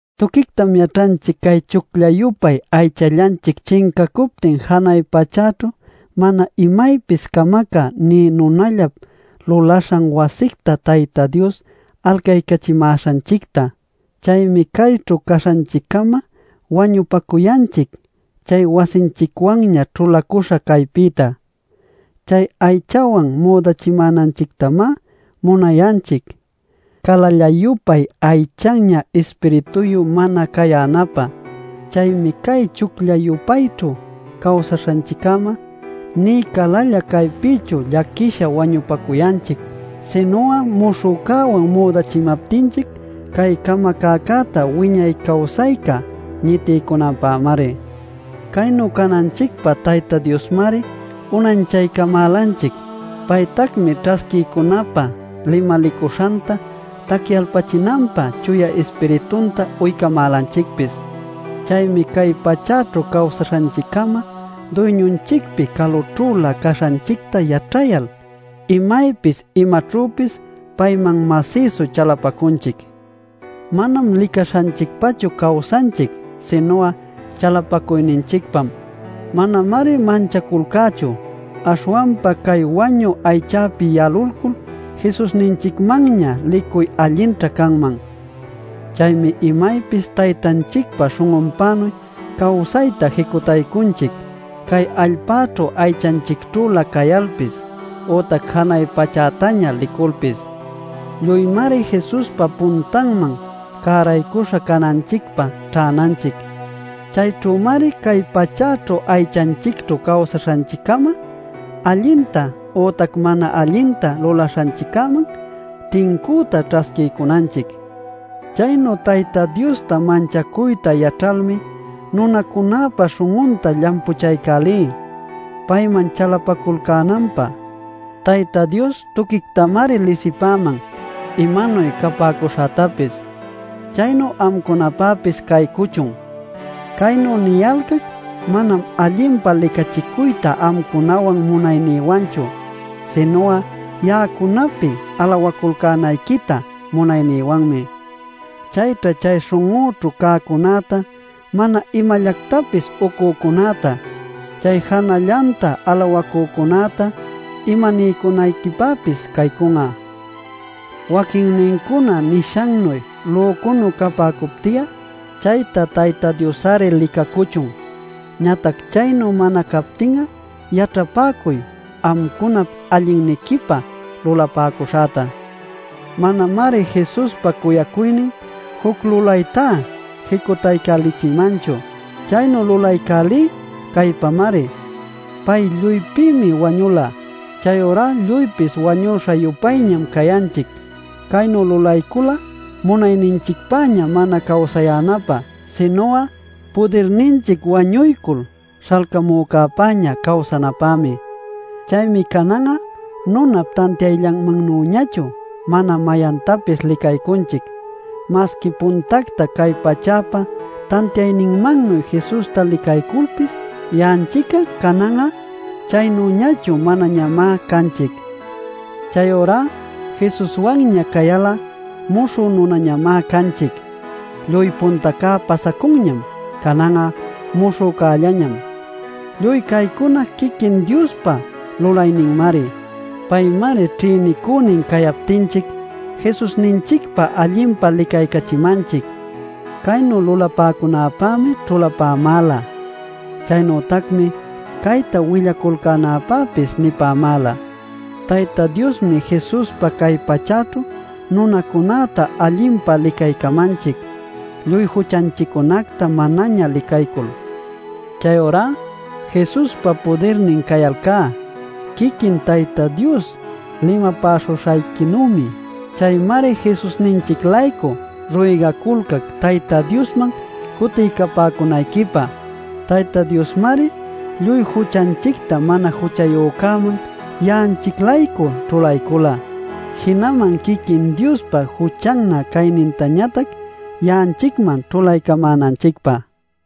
Tuquictam yaćhanchic cay chuclla-yupay aychallanchic chincacuptin janay pachäćhu mana imaypis camacä nï nunallap luläśha wasicta Tayta Dios alcaycachimäśhanchicta. Chaymi cayćhu caśhanchiccama wañupacuyanchic chay wasinchicwanña ćhulacüśha caypïta. Chay aychawan müdachimänanchictamá munayanchic, calalla-yupay aychannä ispirituyu mana cayänapä. Chaymi cay chuclla-yupayćhu cawsaśhanchiccama nï calalla caypïchu llaquisha wañupacuyanchic, sinu'a muśhücäwan müdachimaptinchic cay camacäcäta wiñay cawsayca ñitiycunanpämari. Caynu cananchicpä Tayta Diosmari unanchaycamälanchic. Paytacmi ćhasquiycunapä limalicuśhanta tacyalpachinanpä Chuya Ispiritunta uycamälanchicpis. Chaymi cay pachäćhu cawsaśhanchiccama Duyñunchicpi calućhülä caśhanchicta yaćhayal imaypis imaćhüpis payman masïsu chalapacunchic. Manam licaśhanchicpachu cawsanchic, sinu'a chalapacuyninchicpam. Manamari manchaculcächu; aśhwanpa cay wañü aychäpi yalulcul Jesusninchicmanña licuy allinćha canman. Chaymi imaypis Taytanchicpa śhun'unpänuy cawsayta jicutaycunchic cay allpäćhu aychanchicćhülä cayalpis ütac janay pachätaña liculpis. Lluymari Jesuspa puntanman cäraycuśha cananchicpä ćhänanchic. Chayćhümari cay pachäćhu aychanchicćhu cawsaśhanchiccama allinta ütac mana allinta lulaśhanchicman tincüta ćhasquiycunanchic. Chaynu Tayta Diosta manchacuyta yaćhalmi nunacunäpa śhun'unta llampuchaycälí payman chalapaculcänanpä. Tayta Dios tuquictamari lisipäman imanuy capäcuśhätapis; chaynu amcunapäpis caycuchun. Caynu niyalcac manam allinpa licachicuyta amcunawan munaynïwanchu, sinu'a ya'acunapi alawaculcänayquita munaynïwanmi. Chayćha chay śhun'unćhu cäcunäta mana imallactapis ucücunäta, chay janällanta alawacücunäta imaniycunayquipäpis caycun'a Waquinnincuna nishannuy lücunuy capäcupti'a, chayta Tayta Dios-ari licacuchun. Ñatac chaynu mana capti'a, yaćhapäcuy amcunap allinniquipä lulapäcuśhäta. Manamari Jesuspa cuyacuynin juc lulaytá jicutaycälichimanchu. Chaynu lulaycälí caypamari: pay lluypïmi wañula; chayurá lluypis wañuśha-yupayñam cayanchic. Caynu lulaycula munayninchicpäña mana cawsayänapä, sinu'a pudirninchic wañuycul śhalcamücäpäña cawsanapämi. Chaymi canan'a nunap tantiayllanmannüñachu mana mayantapis licaycunchic. Masqui puntacta cay pachäpa tantiayninmannuy Jesusta licayculpis, ya'anchic'a canan'a chaynüñachu manañamá canchic. Chayurá Jesuswanña cayal'a muśhü nunañamá canchic. Lluy puntaca pasacunñam, canan'a muśhücällañam. Lluy caycuna quiquin Diospa lulayninmari; paymari ćhïnicünin cayaptinchic Jesusninchicpa allinpa licaycachimanchic. Caynu lulapäcunäpämi ćhulapämäla. Chaynütacmi cayta willaculcänäpäpis nipämäla: Tayta Diosmi Jesuspa cay pachäćhu nunacunäta allinpa licaycamanchic, lluy juchanchiccunacta manaña licaycul. Chayurá Jesuspa pudirnin cayalcá quiquin Tayta Dios limapäśhuśhayquinuymi. Chaymari Jesusninchic-laycu ruygaculcac Tayta Diosman cutiycapäcunayquipä. Tayta Diosmari lluy juchanchicta mana juchayücäman ya'anchic-laycu ćhulaycula, jinaman quiquin Diospa juchannä caynintañatac ya'anchicman ćhulaycamänanchicpä.